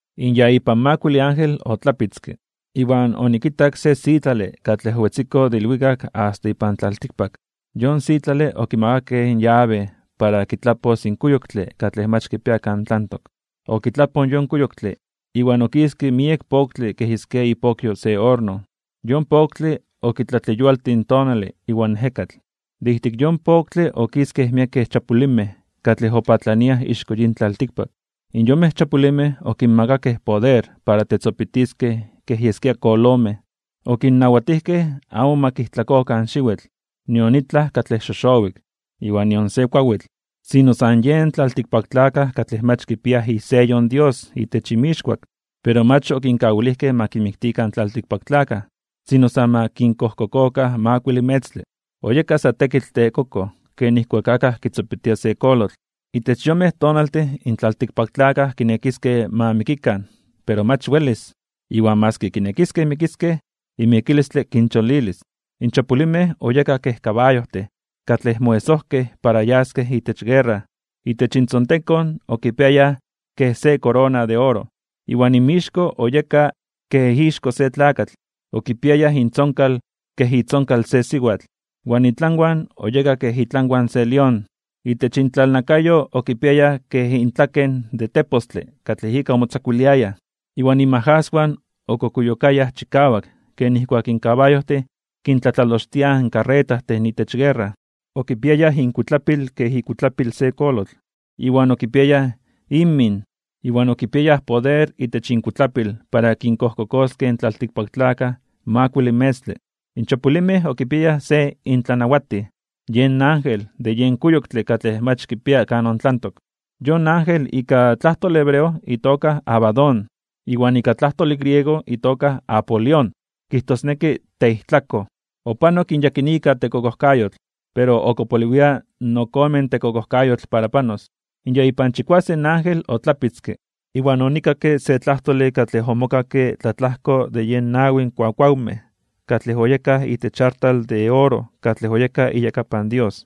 In ya ipan makuile ángel otlapitzke, iwan onikitak se sitlale katlej owetziko de ilwikak asta ipan tlaltikpak. Yon sitlale okimakakej in yabe para kitlapos in kuyoktle katlej mach kipia kan tlantok. Okitlapoj in yon kuyoktle, iwan okiske miek poktle kej yeskia ipokyo se orno. Yon poktle okitlatleyualtij in tonale iwan ejekatl. De ijtik yon poktle okiskej miekej chapulimej katlej opatlaniaj ixko yin tlaltikpak. Iwan yonmej chapulimej okinmakakej poder para tetzopitiskej kej yeskia kolomej. Okinnawatijkej amo ma kijtlakokan in xiwitl, nion itlaj katlej xoxowik, iwan nion se kuawitl, sino san yen tlaltikpaktlakaj katlej mach kipiaj iseyo in Dios itech inmixkuak. Pero mach okinkawilijkej ma kinmiktikan in tlaltikpaktlakaj, sino san ma kinkojkokokan makuile metztle. Oyeka sa tekitl tekokoj ken nijkuak akaj kitzopitia se kolotl. Itech yonmej tonaltin in tlaltikpaktlakaj kinekiskej ma mikikan pero mach welis. Iwan maski kinekiskej mikiskej, in mikilistle kincholilis. In chapulimej (xolinmej) oyekaj kej kabayojtin katlej moesojkej para yaskej itech guerra. Itech intzontekon okipiayaj kej se korona de oro, iwan inmixko oyeka kej ixko se tlakatl. Okipiayaj intzonkal kej itzonkal se siwatl, iwan intlanwan oyeka kej itlanwan se lión. Itech intlalnakayo okipiayaj kej intlaken de tepostle katlej ika omotzakuiliayaj. Iwan inmajaswan okukuyokayaj chikawak ken nijkuak in kabayojtin kintlatlalochtiaj in karretajtin itech guerra. Okipiayaj inkuitlapil kej ikuitlapil se kolotl iwan okipiayaj inmin (inmimij). Iwan okipiayaj poder itech inkuitlapil para kinkojkokoskej in tlaltikpaktlakaj makuile metztle. In chapulimej (xolinmej) okipiayaj se intlanawatij, yen ángel de yen kuyoktle katlej mach kipia kan tlantok. Yon ángel ika tlajtole hebreo itoka Abadón, iwan ika tlajtole griego itoka Apolión, kijtosneki teijtlakoj. Opanok in yakinika tekokojkayotl, pero ok opoliwia ok ome tekokojkayotl para panos. In ya ipan chikuasen ángel otlapitzke, iwan onikakke se tlajtole katlej omokakke tlatlajko de yen nawi kuakuawmej katlej oyekaj itech artal de oro katlej oyekaj iyakapan Dios.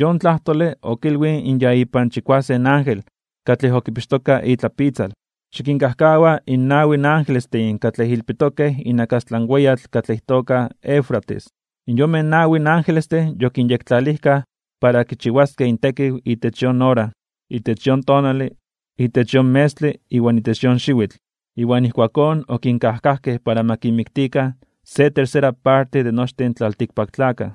Yon tlajtole okilwij in ya ipan chikuasen ángel katlej okipixtoka itlapitzal: ―Xikinkajkawa in nawi angelestin katlej ilpitokej inakastlan weyatl katlej itoka Eufrates. In yonmej nawi angelestin yokinyektlalijkaj para kichiwaskej intekiw itech yon ora, itech yon tonale, itech yon metztle iwan itech yon xiwitl, iwan ijkuakón okinkajkajkej para ma kinmiktikan se tercera parte de nochtin in tlaltikpaktlakaj.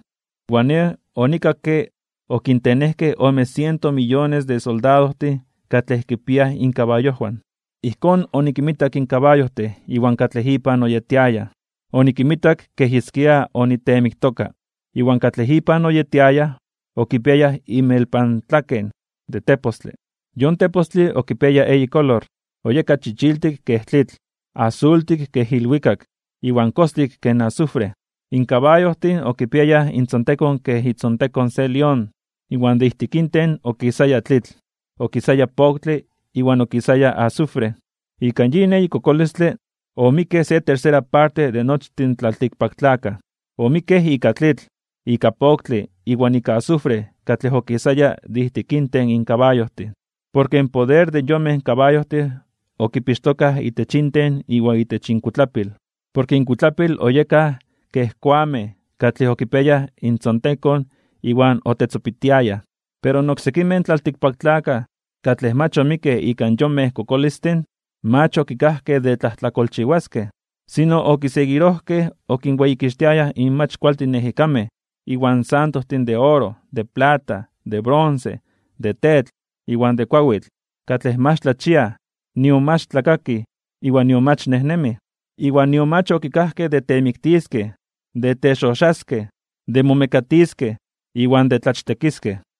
Iwan nej onikakke okintenejkej ome siento miyones de soldadojtin katlej kipiaj inkabayojwan. Ijkón onikinmitak in kabayojtin iwan katlej inpan oyetiayaj, onikinmitak kej yeskia oniteemiktoka. Iwan katlej inpan oyetiayaj okipiayaj inmelpantlaken de tepostle. Yon tepostle okipiaya eyi kolor. Oyeka chichiltik kej tlitl, asultik kej ilwikak, iwan kostik kej azufre. In kabayojtin okipiayaj intzontekon kej itzontekon se lión, iwan de ijtik inten okisaya tlitl, okisaya poktle, iwan okisaya azufre. Ika yin eyi kokolistle, omikkej se tercera parte de nochtin in tlaltikpaktlakaj. Omikkej ika tlitl, ika poktle, iwan ika azufre katlej okisaya de ijtik inten in kabayojtin. Porke in poder de yonmej kabayojtin okipixtokaj itech inten iwan itech inkuitlapil. Porke inkuitlapil oyekaj kej koamej katlej okipiayaj intzontekon iwan otetzopitiayaj. Pero in oksekimej tlaltikpaktlakaj, katlej mach omikkej ika yonmej kokolistin, mach okikajkej de tlajtlakolchiwaskej. Sino okiseguirojkej okinweyikixtiayaj in mach kualtin ejekamej iwan santojtin de oro, de plata, de bronce, de tetl, iwan de kuawitl, katlej mach tlachiaj, nion mach tlakakij, iwan nion mach nejnemij. Iwan nion mach okikajkej de temiktiskej, de texoxaskej (tebrujojwiskej), de momekatiskej, iwan de tlachtekiskej.